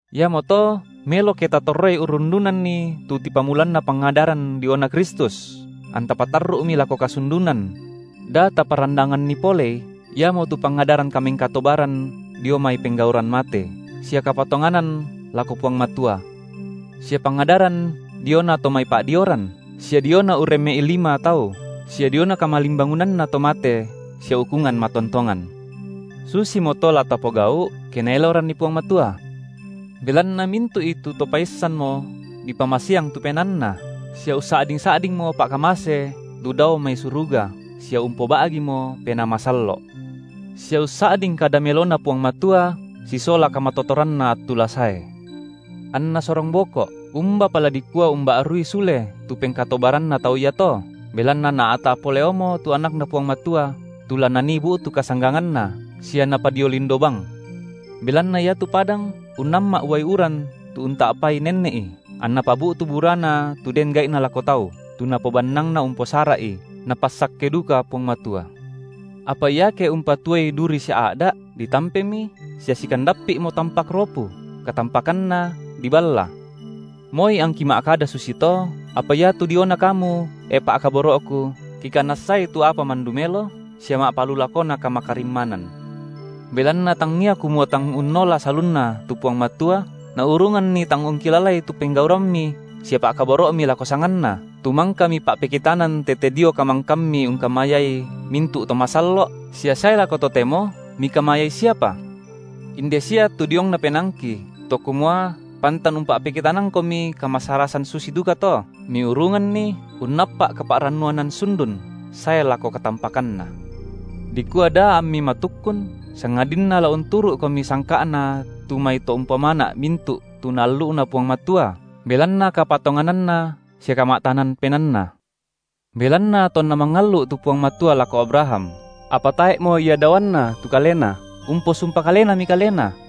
Iamoto melo ke tatorroi urrundunanni tu tipamulanna pangadaran diona Kristus, anta patarru’mi lako kasundunan: da taparandanganni polei, iamotu pangadaran kamengkatobaran dio mai penggauran mate, sia kapatonganan lako Puang Matua, sia pangadaran diona to mai pa’dioran, sia diona urremme’i lima tau, sia diona kamalimbangunanna to mate sia ukungan matontongan. Susimoto la tapogau’, ke Naeloranni Puang Matua. Belanna mintu’i tu to paissanmo dipamasiang tu penaanna, sia ussa’ding-sa’dingmo pa’kamase lu dao mai suruga sia umpoba’gimo Penaa Masallo’, sia ussa’ding kada meloNa Puang Matua sisola kamatotoranna attu la sae, anna sorong boko’, umbapa la dikua umba’rui sule tu pengkatobaranna tau iato, belanna naa’ta’ poleomo tu AnakNa Puang Matua tu la nanii bu’tu kasangganganna, sia napadio lindo bang. Belanna iatu padang, unnamma’ uai uran tu unta’pai nenne’i, anna pabu’tu burana tu den gai’na lako tau, tu napobannangna umposara’i, Napassakke duka Puang Matua. Apa iake umpatuoi duri sia a’da’, ditampemi sia sikandappi’mo tampak ropu, katampakanna diballa. Moi angki ma’kada susito, apa iatu diona kamu, e pa’kaboro’ku, kikanassai tu apa mandu melo, sia ma’palulakona kamakarimmanan. Belanna tangia kumua tang unnola salunna tu Puang Matua Naurunganni tang ungkilalai tu penggaurammi sia pa’kaboro’mi lako sanganNa, tu mangka mipa’pekitanan tete dio kamangkammi ungkamayai mintu’ to masallo’ sia sae lako totemo mikamayai siapa. Inde sia tu diongna penaangki, to kumua pantan umpa’pekitanangkomi kamasarasan susi dukato, miurunganni unnappa’ kapa’rannuanan sundun sae lako katampakanna, dikua da ammi matukkun, sangadinna la unturu’komi sangka’na tu mai to umpomana’ mintu’ tu Naallu’na Puang Matua belanna kapatongananna sia kama’tanan penaanna. Belanna tonna mangallu’ tu Puang Matua lako Abraham, apa tae’mo ia daoanna tu Kalena, umposumpa Kalenami Kalena,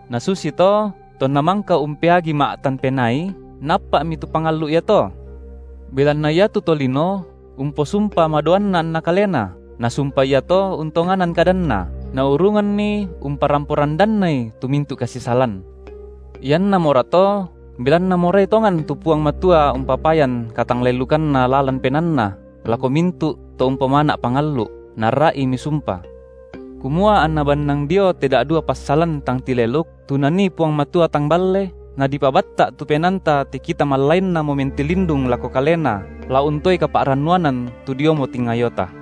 Nasusito tonna mangka umpeagi ma’tan penaai, naappa’mi tu pangallu’ iato. Belanna iatu tolino umposumpa madoanna anna kalena, na sumpa iato untonganan kadanna, naurunganni umparampo randannai tu mintu’ kasisalan. Iannamorato, belanna morai tongan tu Puang Matua umpapayan katanglelukanNa lalan penaanNa lako mintu’ to umpomana’ pangallu’, Naarra’imi sumpa, kumua anna bannang dio te da’dua passalan tang tileluk tu Nanii Puang Matua tang balle, nadipabatta’ tu penaanta te kita mallainnamo mentilindung lako Kalena la untoe kapa’rannuanan tu diomo tingayota,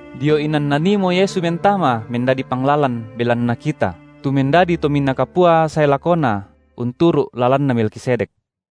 dio inan Naniimo Yesu mentama mendadi Panglalan belanna kita, tu mendadi Tominaa Kapua sae lakona unturu’ lalanna Melkisedek.